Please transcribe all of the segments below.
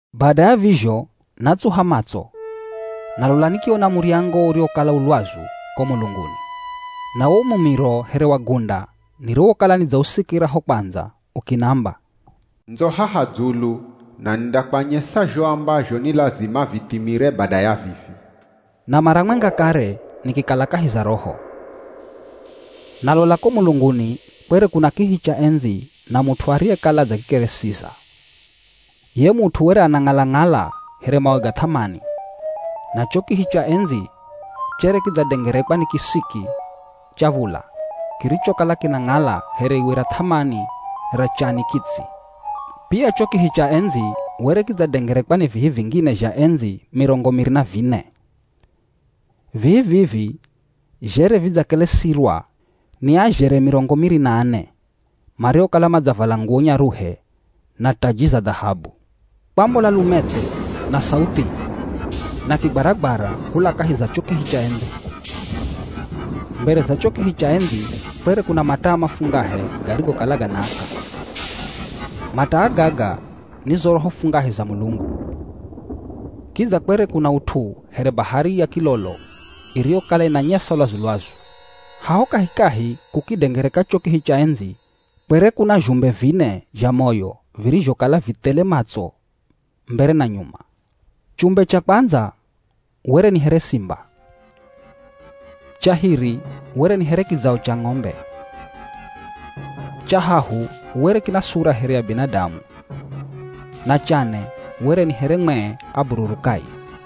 Bada ya vizho, natsuha matso, na lola nikiona muryango uriwokala u lwazu ko mulunguni. Na wo mumiro here wa gunda niriwokala nidzausikira ho kwandza ukinamba, “Ndzo haha dzulu, na nindakwanyesa zho ambazho ni lazima vithimire bada ya vivi.” Na mara mwenga kare nikikala kahi za Roho, na lola ko mulunguni, kwere kuna kihi cha endzi na mut'u ariyekala adzakikeresiza. Ye mut'u were anang'ala-ng'ala here mawe ga th'amani, na cho kihi cha endzi chere kidzadengerekwa ni kisiki cha v̱ula kirichokala kinang'ala here iwe ra th'amani ra chani kitsi. Pia cho kihi cha endzi were kidzadengerekwa ni vihi vingine zha endzi mirongo miri na vine. Vihi vivi zhere vidzakelesirwa ni azhere mirongo miri na ane, mariokala madzavala nguwo nyaruhe na taji za dhahabu. Kwambola lumethe, na sauthi, na kigwaragwara kula kahi za cho kihi cha endzi. Mbere za cho kihi cha endzi kwere kuna mataa mafungahe garigokala ganaaka. Mataa gaga ni zo roho fungahe za Mulungu. Kidza kwere kuna ut'u here bahari ya kilolo iriyokala inanyesa lwazu-lwazu. Haho kahikahi kukidengereka cho kihi cha endzi kwere kuna zhumbe vine zha moyo virizhokala vi thele matso mbere na nyuma. Chumbe cha kwandza were ni here simba. Cha hiri were ni here kidzao cha ng'ombe. Cha hahu were kina sura here ya binadamu, na cha ne were ni here mwee abururukaye.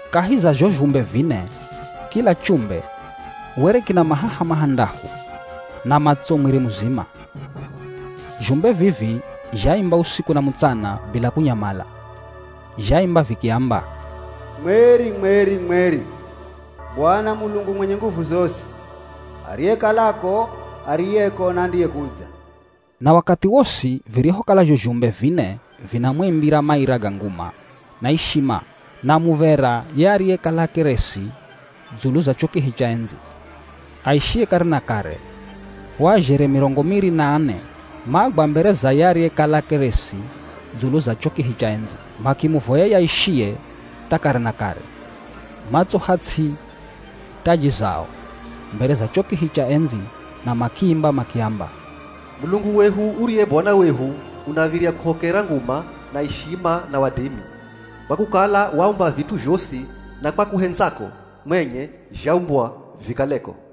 Kahi za zho zhumbe vine, kila chumbe, were kina mahaha mahandahu, na matso mwiri muzima. Zhumbe vivi zhaimba usiku na mutsana bila kunyamala. Zhaimba vikiamba, “Mweri, mweri, mweri Bwana Mulungu mwenye nguvu zosi. Ariyekalako, ariyeko, na andiyekudza.” Na wakathi wosi virihokala zho zhumbe vine vinamwimbira maira ga nguma na ishima na muv̱era ye ariyekala akelesi dzulu za cho kihi cha endzi, aishiye kare na kare, o azhere mirongo miri na ane magwa mbere za ye ariyekala akelesi dzulu za cho kihi cha endzi makimuvoya ye aishiye tha kare na kare. Matsuha ts'i taji zao mbere za cho kihi cha endzi na makiimba makiamba, “Mulungu wehu uriye Bwana wehu unav̱irya kuhokera nguma na ishima na wadimi. Kwa kukala waumba vit'u zhosi, na kwa kuhendzako mwenye zhaumbwa vikaleko.”